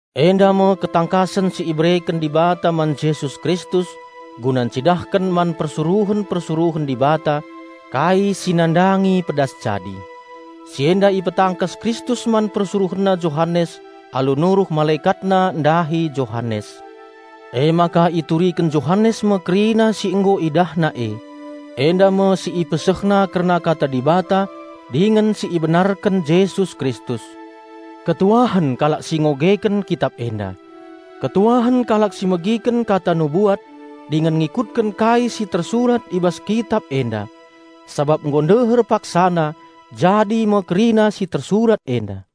Enda me ketangkasen si ibereken Dibata man Jesus Kristus guna ncidahken man persuruhen-persuruhen Dibata kai si nandangi pedas jadi. Si enda ipetangkas Kristus man PersuruhenNa Johanes alu nuruh MalekatNa ndahi Johanes. Emaka ituriken Johanes me kerina si nggo idahna e. Enda me si ipesehna kerna Kata Dibata dingen si ibenarken Jesus Kristus. Malem me ate kalak si ngogeken Kitap enda. Malem me ate kalak si megiken kata nubuat dingen ngikutken kai si tersurat i bas Kitap enda! Sabap nggo ndeher paksana jadi me kerina si tersurat enda.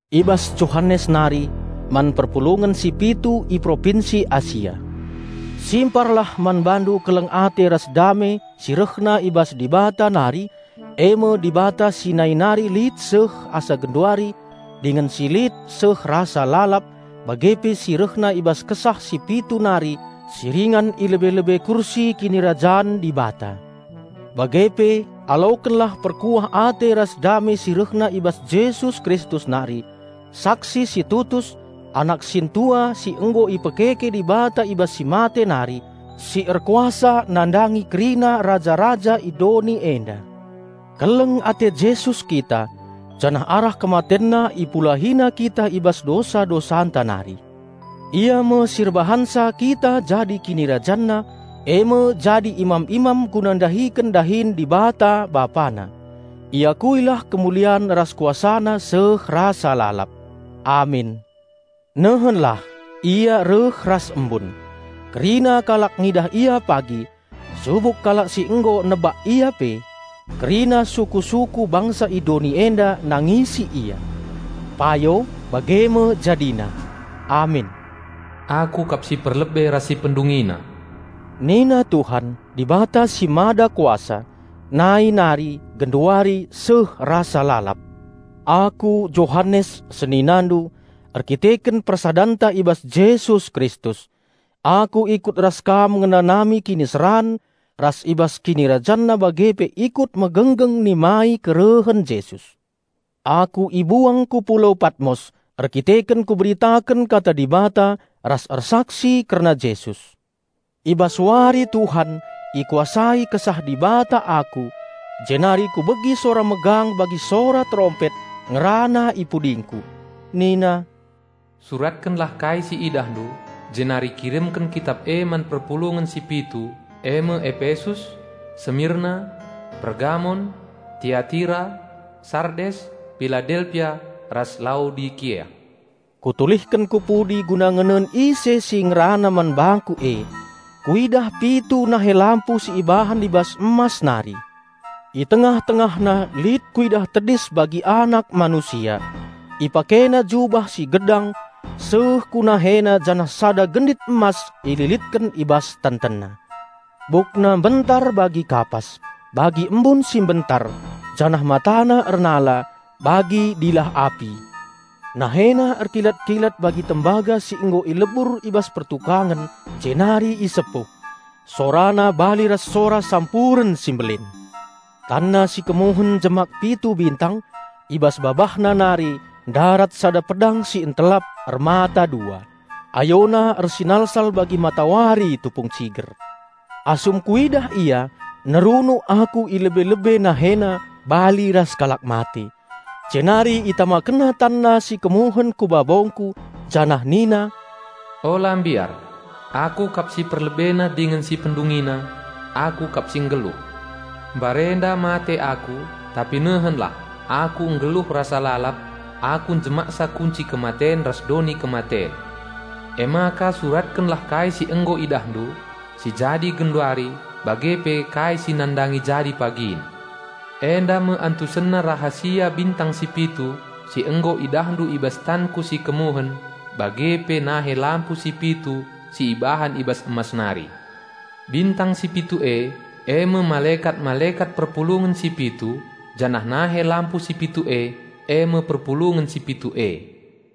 I bas Johanes nari, man perpulungen si pitu i Propinsi Asia. Lias ate ras kemalemen ate si rehna i bas Dibata nari, e me Dibata si nai nari lit seh asa genduari dingen si lit seh rasa lalap, bage pe si rehna i bas Kesah si pitu nari si ringan i lebe-lebe kursi kinirajan Dibata. Bage pe alokenlah perkuah ate ras kemalemen ate si rehna i bas Jesus Kristus nari, saksi si tutus, Anak sintua si nggo ipekeke Dibata i bas si mate nari, si erkuasa nandangi kerina raja-raja i doni enda. Keleng ate Jesus kita, janah arah KematenNa IpulahiNa kita i bas dosa-dosanta nari. Ia me si erbahanca kita jadi KinirajanNa, e me jadi imam-imam guna ndahiken dahin Dibata, BapaNa. Iakuilah kemulian ras KuasaNa seh rasa lalap. Amin. Nehenlah, ia reh ras embun! Kerina kalak ngidah Ia pagi, subuk kalak si nggo nebak ia pe. Kerina suku-suku bangsa i doni enda nangisi Ia. Payo, bage me jadina. Amin. "Aku kap si perlebe ras si pendungina," nina Tuhan, Dibata si Mada Kuasa, nai nari, genduari, seh rasa lalap. Aku Johanes, seninandu, erkiteken persadanta i bas Jesus Kristus. Aku ikut ras kam ngenanami kiniseran ras i bas KinirajanNa bage pe ikut megenggeng nimai kerehen Jesus. Aku ibuang ku Pulau Patmos erkiteken kuberitaken Kata Dibata ras ersaksi kerna Jesus. I bas wari Tuhan ikuasai Kesah Dibata aku, jenari kubegi sora megang bagi sora terompet, ngerana i pudingku. Nina, "Suratkenlah kai si idahndu, jenari kirimken Kitap e man perpulungen si pitu eme Epesus, Semirna, Pergamon, Tiatira, Sardes, Piladelpia ras Laodikea." Kutulihken ku pudi guna ngenen ise si ngerana man bangku e. Kuidah pitu nahe lampu si ibahan i bas emas nari. I tengah-tengahna lit kuidah tedis bagi Anak Manusia. IpakeNa jubah si gedang seh ku NaheNa janah sada gendit emas ililetken i bas TentenNa. Bukna mbentar bagi kapas, bagi embun si mbentar, janah MataNa erndilap, bagi api; NaheNa erkilat-kilat bagi tembaga si nggo ilebur i bas pertukangen jenari isepuh. SoraNa bali ras sora sampuren si mbelin. TanNa si kemuhen njemak pitu bintang, i bas BabahNa nari ndarat sada pedang si ntelap, ermata dua. AyoNa ersinalsal bagi matawari tupung ciger. Asum kuidah Ia, nerunuk aku i lebe-lebe NaheNa bali ras kalak mate. Jenari ItamakenNa TanNa si kemuhen ku babongku, janah nina, "Ula mbiar! Aku kap si perlebena dingen si pendungina. Aku kap si nggeluh! Mbarenda mate Aku, tapi nehenlah, Aku nggeluh rasa lalap. Aku njemaksa kunci kematen ras doni kematen. Emaka suratkenlah kai si nggo idahndu, si jadi genduari, bage pe kai si nandangi jadi pagin. Enda me antusenna rahasia bintang si pitu si nggo idahndu i bas tanKu si kemuhen bage pe nahe lampu si pitu si ibahan i bas emas nari; bintang si pitu e, e me malekat-malekat perpulungen si pitu, janah nahe lampu si pitu e, e me perpulungen si pitu e."